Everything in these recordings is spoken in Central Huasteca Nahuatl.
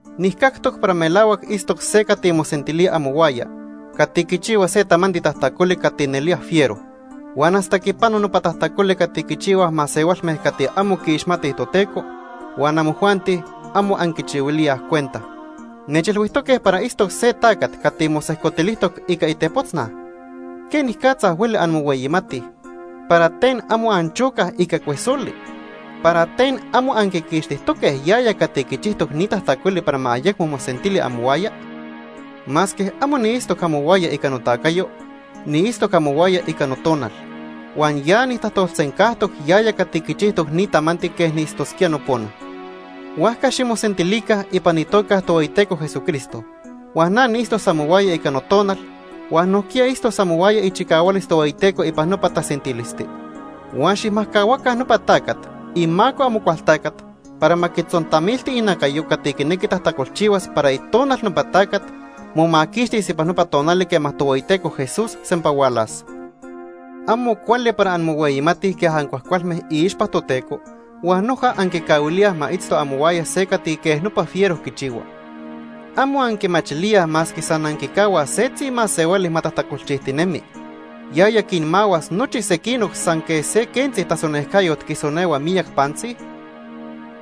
Nijcactoc para melahuac itztoc se cati mosentilía amohuaya cati quichihua se tamanti tajtacoli cati nelía fiero, huan hasta quipano nopa tajtacoli cati quichihuaj masehualme cati amo quiixmatij Toteco huan amojuanti amo anquichihuilíaj cuenta. Nechilhuijtoque para itztoc se tacat cati mosejcotilijtoc ica itepotznaj. ¿Quenicatza hueli anmohueyimatij? ¿Para ten amo anchocaj ica cuesoli? ¿Para ten amo anquiquixtijtoque yaya cati quichijtoc ni tajtacoli para ma ayecmo mosentili amohuaya? Masque amo niitztoc amohuaya ica notacayo, niitztoc amohuaya ica notonal, huan ya nijtajtolsencajtoc yaya cati quichijtoc ni tamanti quej niitztosquía nopona. Huajca ximosentilica ipan itoca Ica itequiticayo. Tohueyiteco Jesucristo huan na niitztos amohuaya ica notonal, huan nojquiya itztos amohuaya ichicahualis Tohueyiteco ipan nopa tasentilisti. Huan xijmajcahuaca nopa tacat imaco Amocualtacat para ma quitzontamilti inacayo cati quinequi tajtacolchihuas para itonal nopa tacat momaquixtis ipan nopa tonali quema Tohueyiteco Jesús sempa hualas. Amo cuali para anmohueyimatij quej ancuajcualme iixpa Toteco huan noja anquicahuilíaj ma itzto amohuaya se cati quej nopa fiero quichihua. ¿Amo anquimachilíaj masque san anquicahuaj setzi masehuali ma tajtacolchijtinemi, yaya quinmahuas nochi sequinoc san quej se quentzi tasonejcayot quisonehua miyac pantzi?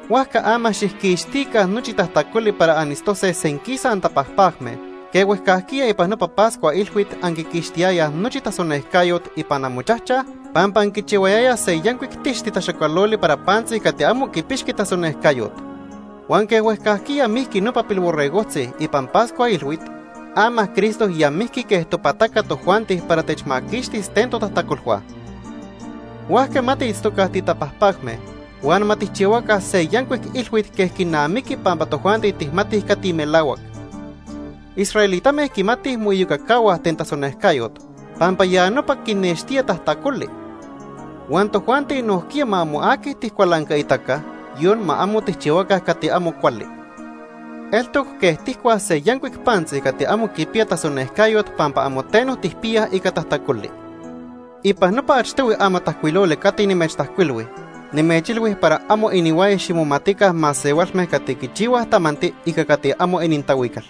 Huajca ama xijquixtica nochi tajtacoli para anitztose senquisa antapajpacme quej huejcajquiya ipan nopa Pascua Ilhuit anquiquixtiyayaj nochi tasonejcayot ipan amochajchaj pampa anquichihuayayaj se yancuic tixti taxacualoli para pantzi cati amo quipixqui tasonejcayot. Huan quej huejcajquiya mijqui nopa pilborregojtzi ipan Pascua Ilhuit, ama Cristo ya mijqui quej topataca tojuanti para techmaquixtis ten totajtacolhua. Huajca ma tiitztoca titapajpacme huan ma tijchihuaca se yancuic ilhuit quej quinamiqui pampa tojuanti tijmatij cati melahuac. Israelitame quimatij moiyocacahuaj ten tasonejcayot pampa ya nopa eltoc quinextía tajtacoli, huan tojuanti nojquiya ma amo aqui tijcualancaitaca, yon ma amo tijchihuaca cati amo cuali. Eltoc quej tijcuaj se yancuic pantzi cati amo quipiya tasonejcayot pampa amo teno tijpiyaj ica tajtacoli. Ipan nopa achtohui amatajcuiloli cati nimechtajcuilhui, nimechilhui para amo inihuaya ximomatica masehualme cati quichihuaj tamanti ica cati amo inintahuical.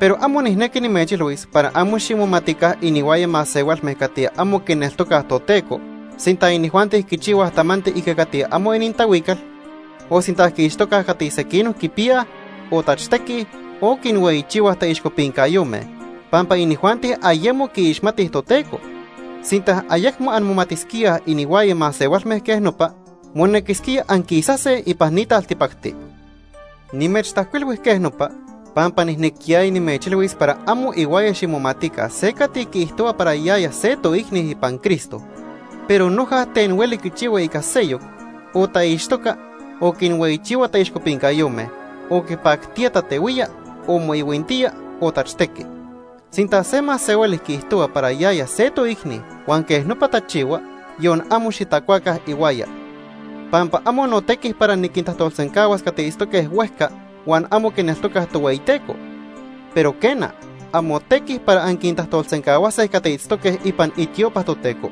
Pero amo nijnequi nimechilhuis para amo ximomatica inihuaya masehualme cati amo quineltocaj Toteco sinta inijuanti quichihuaj tamanti ica cati amo inintahuical, o sinta quiixtocaj cati sequinoc quipiyaj, o tachtequij, o quinhueyichihuaj taixcopincayome, pampa inijuanti ayemo quiixmatij Toteco. Sinta ayecmo anmomatisquíaj inihuaya masehualme quej nopa, monequisquía anquisase ipan ni taltipacti. Nimechtajcuilhui quej nopa pampa nijnequiyaya nimechilhuis para amo ihuaya ximomatica se cati quiijtohua para yaya se toicni ipan Cristo pero noja ten hueli quichihua ica seyoc, o taixtoca, o quinhueyichihua taixcopincayome, o quipactía tatehuía, o moihuintía, o tachtequi. Sinta se masehuali quiijtohua para yaya se toicni huan quej nopa tachihua, yon amo xitacuaca ihuaya. Pampa amo notequi para niquintajtolsencahuas cati itztoque huejca huan amo quineltocaj Tohueyiteco. Pero quena, amotequi para anquintajtolsencahuase cati itztoque ipan itiopa Toteco.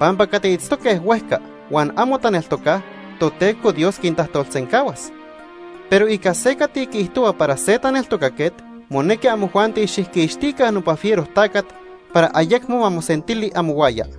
Pampa cati itztoque huejca huan amo taneltocaj, Toteco Dios quintajtolsencahuas. Pero ica se cati quiijtohua para se taneltocaquet, monequi amojuanti xijquixtica nopa fiero tacat para ayecmo ma mosentili amohuaya.